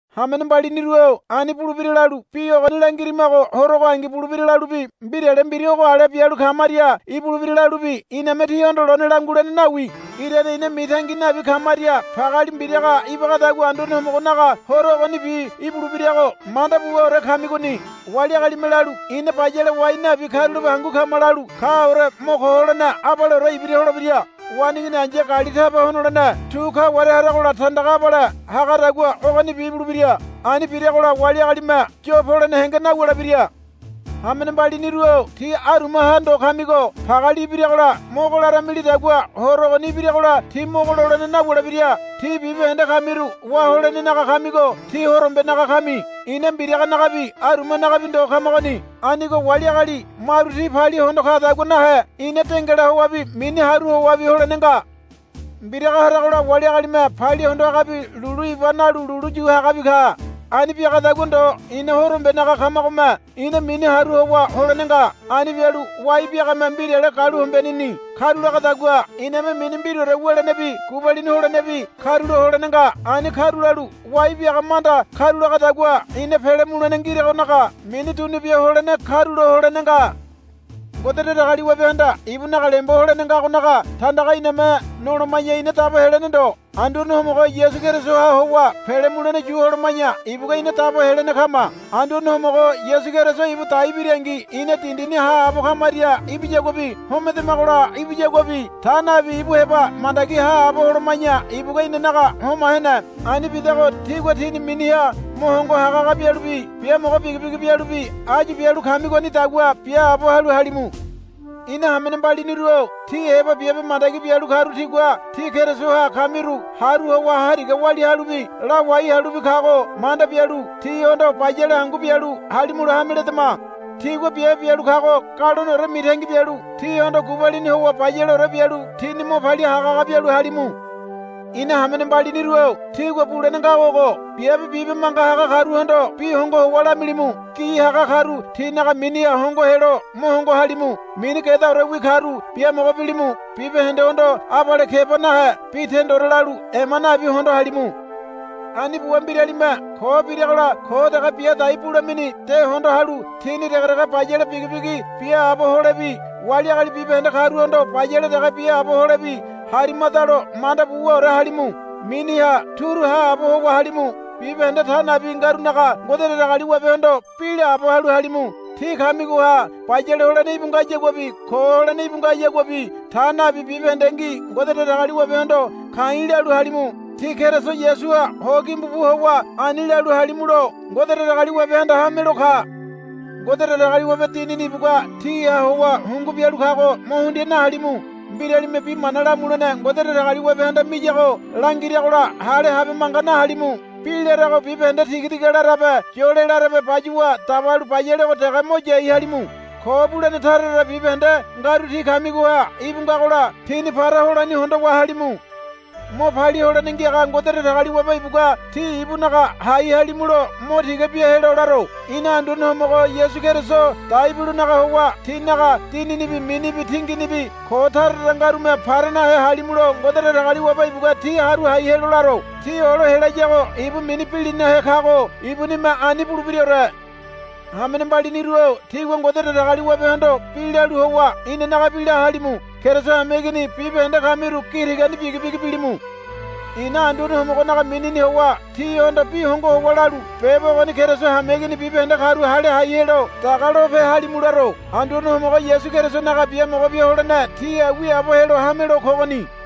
Hamene mbaliniru-o ani bulebira lalu bi ogoni langirimago horo ogoangi ibulebira lalubi mbirale mbira ogo ale bialu kamaria ibulebira lalubi iname tíhondo lone langulene nawi. Irane ina mitangi nabi kamaria pageali mbiraga ibagadagua Anduane Homogonaga Horo ogonibi ibulebirago manda buwaore kamigoni. Wali agalime lalu, Ina bayale wai nabi karulape hangu kama, lalu kaore mo ko holene abaleore ibira holebira. Waneigini ai̱ya gali taba honolene tu kaware haragola tandaga abale hagadagua ogonibi ibulebira. Ani biragola wali agalime yo polene henge nawulebira. Hamene mbaliniru-o tí arumaha ndo kamigo pageali ibiragola mogo laramilidagua Horo ogoni ibiragola tí mogo lolene nawulebira. Tí bibahende kamiru wá holenenaga kamigo tí horombenaga kami. Ina mbiraganagabi arumanagabi ndo kamagoni. Anigo wali agali maru ti palia hondo kadagua nahe ina dengala howabi mini haru howabi holene nga. Mbiraga haragola wali agalime palia hondo hagabi lulu iba nalu lulu yu hagabi ka. Ani biagadagua ndo ina horombenaga kamagome ina mini haru howa holene nga. Ani bialu wai biagame mbirale galuhombeneni karulagadagua iname mini mbiraore wulenebi gubalini holenebi karulo holene nga. Ani karulalu wai biaga manda karulagadagua ina pele mulene ngiragonaga mini dunu bia holene karulo holene nga. Ngode Datagaliwabehanda ibunaga lembo holene ngagonaga tandaga iname noloma̱ya ina dabo helene ndo. Anduane Homogo Yasu Kerisoha howa pele mulene yu holoma̱ya ibugua ina dabo helene kama. Anduane Homogo Yasu Keriso ibu dai birangi ina dindini haabo kamaria ibiyaguabi homedamagola ibiyaguabi ta nabi ibu heba mandagi haabo holoma̱ya ibugua inanaga homa hene. Ani bidago tígua tíni miniha mo hongo hagahaga bialubi biamogo bigibigi bialubi áyu bialu kamigonidagua biaabo halu halimu. Ina hamene mbaliniru-o tí heba biabe mandagi bialu karu tigua tí Kerisoha kamiru haru howa hariga walia halubi lawai halubi kago manda bialu tihondo bayale hangu bialu halimulo hame ledama. Tigua biabe bialu kago galoneore mitangi bialu tihondo gubalini howa bayaleore bialu tíni mo palia hagahaga bialu halimu. Ina hamene mbaliniru-o tígua bulene ngago ogo. Biabe bibe manga haga karuhondo bi hongo howa lamilimu. Gi haga karu tinaga miniha hongo helo mo hongo halimu. Mini gedaorewi karu biamogo bilimu. Bibahendehondo abale keba nahe bi tendore lalu ema nabi hondo halimu. Ani buwa mbiralime ko biragola ko dege bia dai bulamini de hondo halu tíni degedege bayale bigibigi biaabo holebi wali agali bibahende karuhondo bayale dege biaabo holebi harimadalo manda buwaore halimu. Miniha turu haabo howa halimu. Bibahende ta nabi ngarunaga Ngode Datagaliwabehondo bi laabo halu halimu. Tí kamigoha bayale holene íbu ngayaguabi ko holene íbu ngayaguabi ta nabi bibahendengi Ngode Datagaliwabehondo ka̱i̱ lalu halimu. Tí Keriso Yasuha ho gimbu bu howa ani lalu halimulo Ngode Datagaliwabehanda hamelo ka. Ngode Datagaliwabe Dinini ibugua tíha howa hungu bialu kago mo hundia nahalimu. Mbiralime bi mana lamulene Ngode Datagaliwabehanda miyago langiragola hale habe manga nahalimu. Bi larago bibahende tigatiga larabe yole larabe bayuwa dabalu bayalego dege mo yai halimu. Ko bulene tara tara bibahende ngaru tí kamigoha íbu ngagola tíni para holani hondowa halimu. Mo palia holene ngiaga Ngode Datagaliwabe ibugua tí ibunaga hai halimulo mo tiga bia helo laro. Ina Anduane Homogo Yasu Keriso dai bilonaga howa tínaga dininibi minibi tinginibi ko tara tara ngarume para nahe halimulo Ngode Datagaliwabe ibugua tí haru hai helo laro. Tí olo helayago ibu mini bilinahe kago ibunime ani bulebiraore. Hamene mbaliniru-o tígua Ngode Datagaliwabehondo bi lalu howa inanagabi la halimu. Keriso hameigini bibahende kamiru gi tigani bigibigi bilimu. Ina Anduane Homogonaga minini howa tíhondo bi hongo howa lalu beba ogoni Keriso hameigini bibahende karu hale hai helo daga lope halimu laro. Anduane Homogo Yasu Kerisonaga biamogo bia holene tíha wiaabo helo hamelo kogoni.